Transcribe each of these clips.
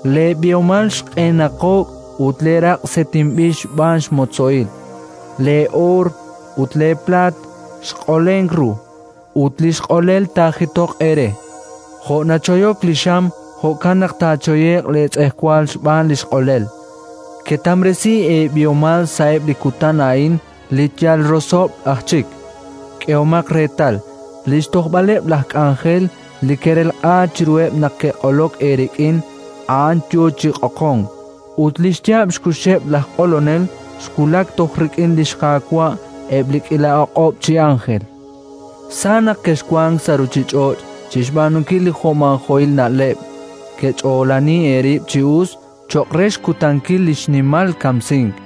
Leeb'ihomal xq'enaq'o'k ut leeraq' set'inb'il xb'aan xmotzo'il. Lee'oor ut leeplaat xq'olenk ru, ut li xq'olel taajitoq eere. Jo' nachoyok li xam, jo'kan naq taachoye'q leetz'ejwal xb'aan li xq'olel: ketamresi eeb'ihomal sa'eb' li kutan a'in li yal rosob'l aj chik! K'ehomaq reetal: li xtojb'aleb' laj k'anjel li kerelq'a chiruheb' naq ke'q'olok eerik'in, a'an yo chi q'oqonk; ut li xyaab' xkuxeb' laj q'olonel xwulak toj rik'in li xQaawa' eb' li k'iila o'q'ob' chi ánjel. Sa naq kexwank sa' ruuchich'och' chi xb'aanunkil li jo'maajo'il na'leb': kech'oolani eerib' chi us cho'q re xkutankil li xnimal kamsink!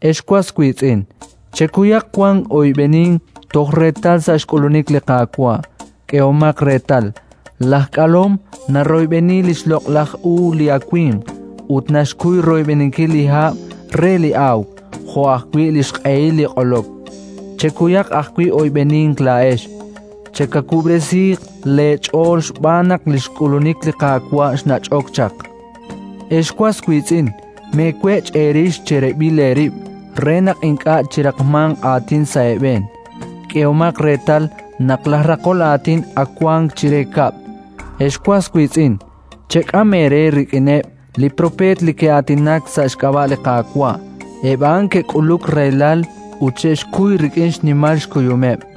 Ex was wiitz'in, chekuyaq wan oyb'enink toj reetal sa' xk'ulunik li Qaawa'. K'ehomaq reetal: laj k'alom naroyb'eni li xloq'laj u li awimq, ut naxkuy royb'eninkil li hab' re li awk jo' ajwi' li xq'ehil li q'olok. Chekuyaq ajwi' oyb'enink laa'ex. Chekawub'resiiq leech'ool xb'aan naq li xk'ulunik li Qaawa' xnach'ok chaq. Ex was wiitz'in, meewech' eerix cherib'il eerib' re naq ink'a' chiraqmanq aatin sa' eeb'een. K'ehomaq reetal naq laj Raqol aatin ak wank chire kab'l. Ex was wiitz'in, chek'am eere rik'ineb' li propeet li ke'aatinak sa' xk'ab'a' li Qaawa': eb' a'an ke'k'uluk rahilal ut xe'xkuy rik'in xnimal xkuyumeb'.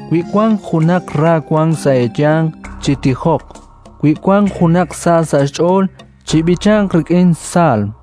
Wi wank junaq ra wank sa' eeyanq, chitijoq. Wi wank junaq sa sa' xch'ool, chib'ichanq rik'in saalm.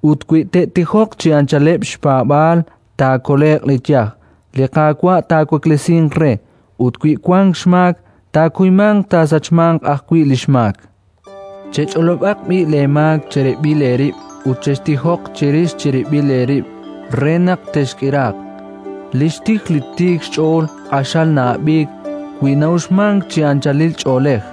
Ut wi te'tijoq chi anchaleb' xpaab'aal, taakole'q li yaj; li Qaawa' taawaklesinq re. Ut wi wank xmaak, taakuymanq taasachmanq ajwi' li xmaak. Chech'olob'aq b'i' leemaak cherib'il eerib' ut chextijoq cherix cherib'il eerib' re naq texk'iraaq. Li xtij li tiik xch'ool q'axal na'ab'iik, wi na'uxmank chi anchalil ch'oolej.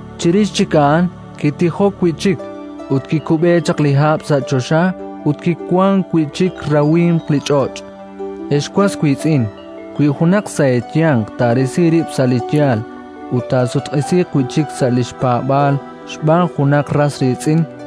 Chirix chik a'an kitijok wi' chik, ut kikub'e chaq li hab' sa' choxa ut kiwank wi' chik rawimq li ch'och'. Ex was wiitz'in, wi junaq sa' eeyanq taarisi rib' sa' li yaal ut taasutq'isiiq wi' chik sa' li xpaab'aal xb'aan junaq ras riitz'in,